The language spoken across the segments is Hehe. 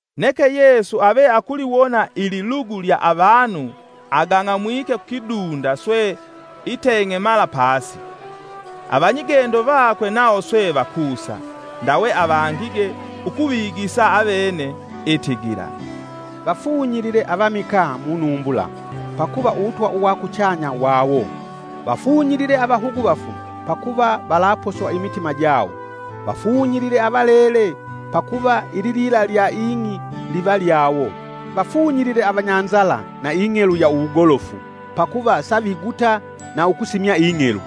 Neke Yesu ave akuliwona ililugu lya avanu agang'amwike kukidunda swe iteng'emala pasi. Avanyigendo vakwe nawo swe vakusa, ndawe avangige ukuvigisa avene itigila: “Vafunyilile avamikaa munumbula, pakuva uwutwa uwa kuchanya wawo. Vafunyilile avahuguvafu pakuva valaposwa imitima jawo. Vafunyilile avalele, pakuva ililila lya ing'i liva lyawo. Vafunyilile avanyanzala na ing'elu ya uwugolofu, pakuva saviguta na ukusimya ing'elu.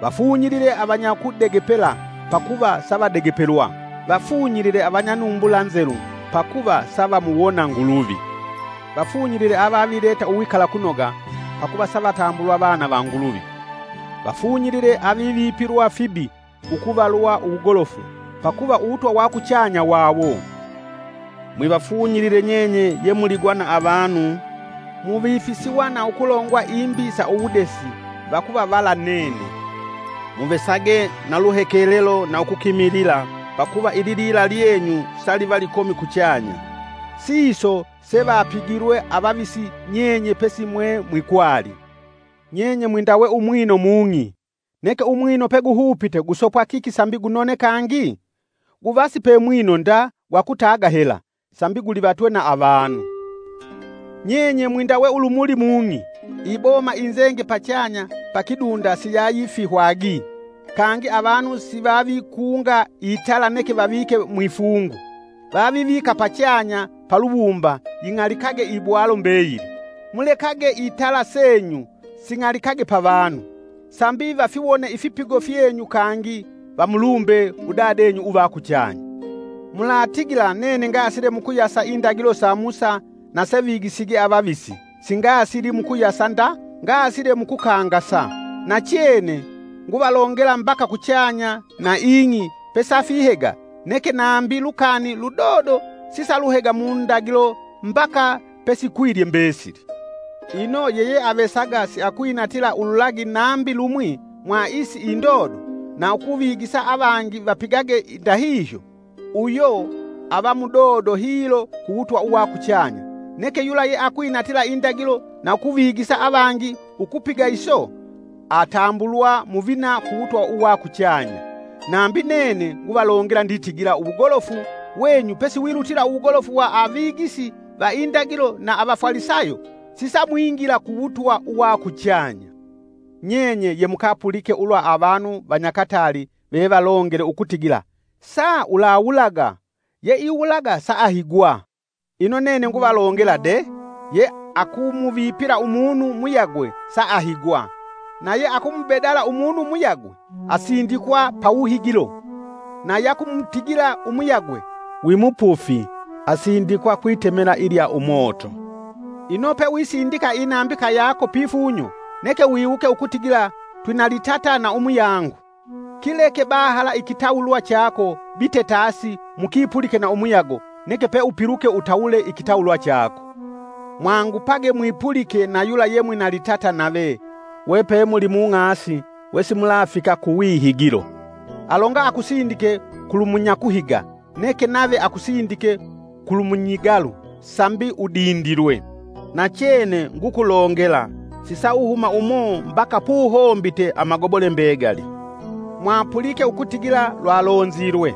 Vafunyilile avanyakudegepela, pakuva savadegepelwa. Vafunyilile avanyanumbula nzelu, pakuva savamuwona Nguluvi. Vafunyilile avavileta uwikalakunoga pakuva savatambulwa, vana va Nguluvi. Vafunyilile avivipilwa fibi ukuvalwa uwugolofu, pakuva Uwutwa wa kuchanya wawo! “Mwivafunyilile nyenye yemuligwa na avanu, muvifisiwa na ukulongwa imbi sa uwudesi vakuvavala nene. Muvesage na luhekelelo na ukukimilila pakuva ililila lyenyu saliva likomi kuchanya, siso se vapigilwe avavisi nyenye pesimwe mwikwali.” “Nyenye mwindawe umwino mung'i! Neke umwino peguhupite kusopwa kiki sambi gunone kangi? Guva sipe mwino nda gwakutaga hela, sambi gulivatwe na avanu.” “Nyenye mwindawe ulumuli mung'i! Iboma inzenge pachanya pakidunda siyayifihwagi. Kangi avanu sivavikunga itala neke vavike mwifungu, vavivika pachanya paluwumba ying'alikage ibwalo mbeyili. Mulekage itala senyu sing'alikage pa vanu, sambi vafiwone ifipigo fyenyu, kangi vamulumbe udadenyu uva kuchanya. “Mulatigila nene ngasile mukuyasa indagilo sa Musa na sevigisige avavisi, singasili mukuyasa nda ngasile mukukangasa. Nachene nguvalongela mbaka kuchanya na ing'i pesafihega neke nambi lukani ludodo sisaluhega mundagilo mbaka pesikwilye mbesili. Ino yeyeavesaga siakwinatila ululagi nambi lumwi mwa isi indodo na ukuvigisa avangi vapigage ndahihyo, uyo ava mudodo hilo ku wutwa uwa kuchanya. Neke yula yeakwinatila indagilo na ukuvigisa avangi ukupiga iso atambulwa muvina ku wutwa uwa kuchanya. Nambi nene nguvalongela nditigila uwugolofu wenyu pesiwilutila uwugolofu uwa avigisi va indagilo na avafalisayo sisamwingila ku wutwa uwa kuchanya. “Nyenye yemukapulike ulwa avanu vanyakatali vevalongele ukutigila ‘sa ulawulaga! Ye iwulaga saahigwa’ Ino nene nguvalongela de, ye akumuvipila umunu muyagwe saahigwa. Naye akumubedala umunu muyagwe asindikwa pawuhigilo. Na yakumutigila umuyagwe: ‘Wimupufi’ asindikwa kwitemela ilya umoto. Ino pewisindika inambika yako pifunyo neke wiwuke ukutigila twinalitata na umuyangu, Kileke bahala ikitawulwa chako bite tasi mukipulike na umuyago neke peupiluke utawule ikitawulwa chako. “Mwangupage mwipulike na yula yemwina litata nave we pe mulimung'asi wesimulafika kuwihigilo. Alonga akusindike kulumunyakuhiga, neke nave akusindike kulumunyigalu sambi udindilwe. Nachene ngukulongela, sisauhuma umo mbaka puhombite amagobole mbegali. “Mwapulike ukutigila lwalonzilwe: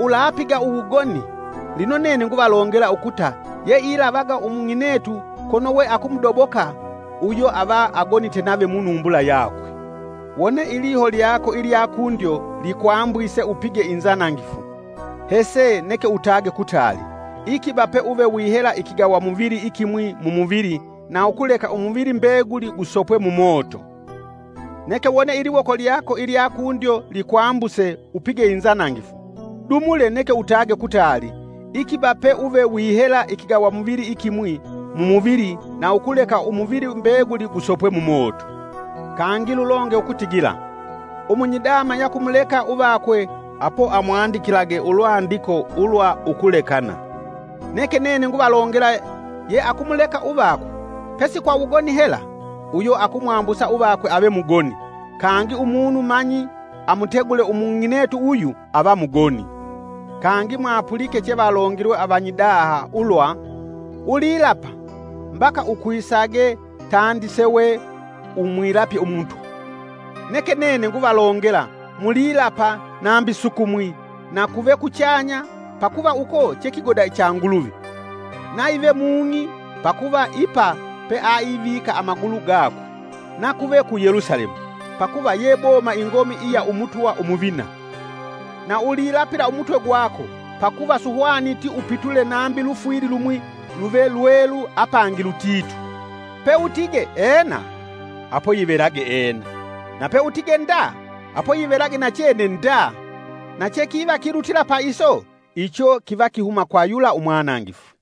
‘Ulapiga uwugoni’ Ino nene nguvalongela ukuta ye ilavaga umung'inetu kono we akumudoboka uyo ava agonite nave munumbula yakwe. Wone iliho lyako ilyakundyo likwambuse upige inzanangifu hese neke utage kutali, ikiba pe uve wihela ikigawamuvili ikimwi mumuvili na ukuleka umuvili mbeguli gusopwe mumoto. Neke wone iliwoko lyako ilyakundyo likwambuse upige inzanangifu, dumule neke utage kutali. Ikiba pe uve wihela ikigawamuvili ikimwi mumuvili na ukuleka umuvili mbeguli gusopwe Mumoto.” “Kangi lulonge ukutigila: ‘Umunyidama yakumuleka uvakwe apo amwandikilage ulwandiko ulwa ukulekana.’ Neke nene nguvalongela ye akumuleka uvakwe, pesi kwa wugoni hela, uyo akumwambusa uvakwe ave mugoni; Kangi umunu manyi amutegule umung'inetu uyu ava mugoni.” “Kangi mwapulike chevalongilwe avanyidaha ulwa, ‘Ulilapa, mbaka ukwisage tandi sewe umwilapye Umutwa.’ Neke nene nguvalongela, mulilapa nambi sukumwi; na kuve kuchanya, pakuva uko chekigoda cha Nguluvi. Naive mung'i, pakuva ipa peaivika amagulu gakwe; nakuve ku Yelusalemu, pakuva ye boma ingomi iya umutwa umuvina. Na ulilapila umutwe gwako, pakuva suhwaniti upitule nambi lufwili lumwi luve lwelu apangi lutitu. Peutige, ‘Ena’, apo, yivelage ‘Ena’; na peutige, ‘Nda’, apo yivelage nachene ‘Nda’ Na chekiva kilutila pa iso icho kiva kihuma kwa yula umwanangifu.”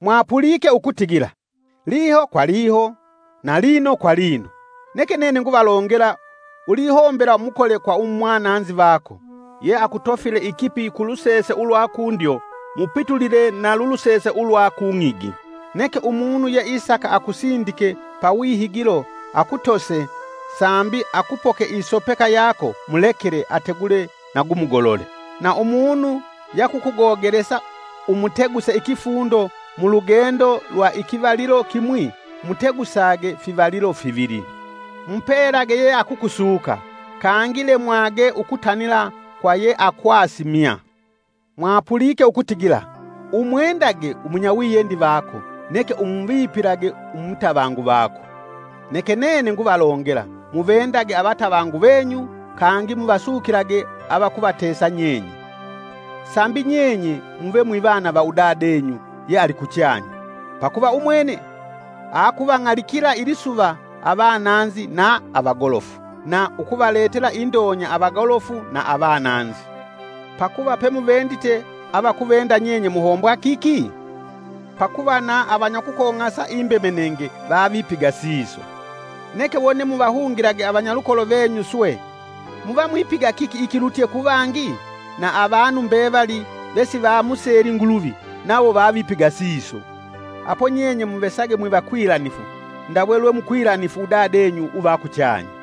“Mwapulike ukutigila: ‘Liho kwa liho, na lino kwa lino.’ Neke nene nguvalongela ulihombela mukole kwa umwananzi vako. Yeakutofile ikipi kulusese ulwa kundyo mupitulile na lulusese ulwa kung'igi. Neke umunu yeisaka akusindike pawihigilo akutose sambi akupoke isopeka yako mulekele ategule na gumugolole, na umunu yakukugogelesa umuteguse ikifundo mulugendo lwa ikivalilo kimwi mutegusage fivalilo fivili. Mupelage ye akukusuka, kangi lemwage ukutanila kwa yeakwasimya.” “Mwapulike ukutigila: ‘Umwendage umunyawiyendi vako neke umuvipilage umutavangu vako.’ Neke nene nguvalongela, muvendage avatavangu venyu kangi muvasukilage avakuvatesa nyenye. Sambi nyenye muve mwivana va Udadenyu yealikuchanya. Pakuva umwene akuvang'alikila ilisuva avananzi na avagolofu, na ukuvaletela indonya avagolofu na avananzi. Pakuva pemuvendite avakuvenda nyenye muhombwa kiki? Pakuva na avanyakukong'asa imbemenenge vavipiga siso! Neke wone muvahungilage avanyalukolo venyu swe, muvamwipiga kiki ikilutye kuvangi? Na avanu mbevali vesivamuseli Nguluvi nawo vavipiga siso. Apo nyenye muvesage mwivakwilanifu, ndawe lwemukwilanifu Udadenyu uva kuchanya.”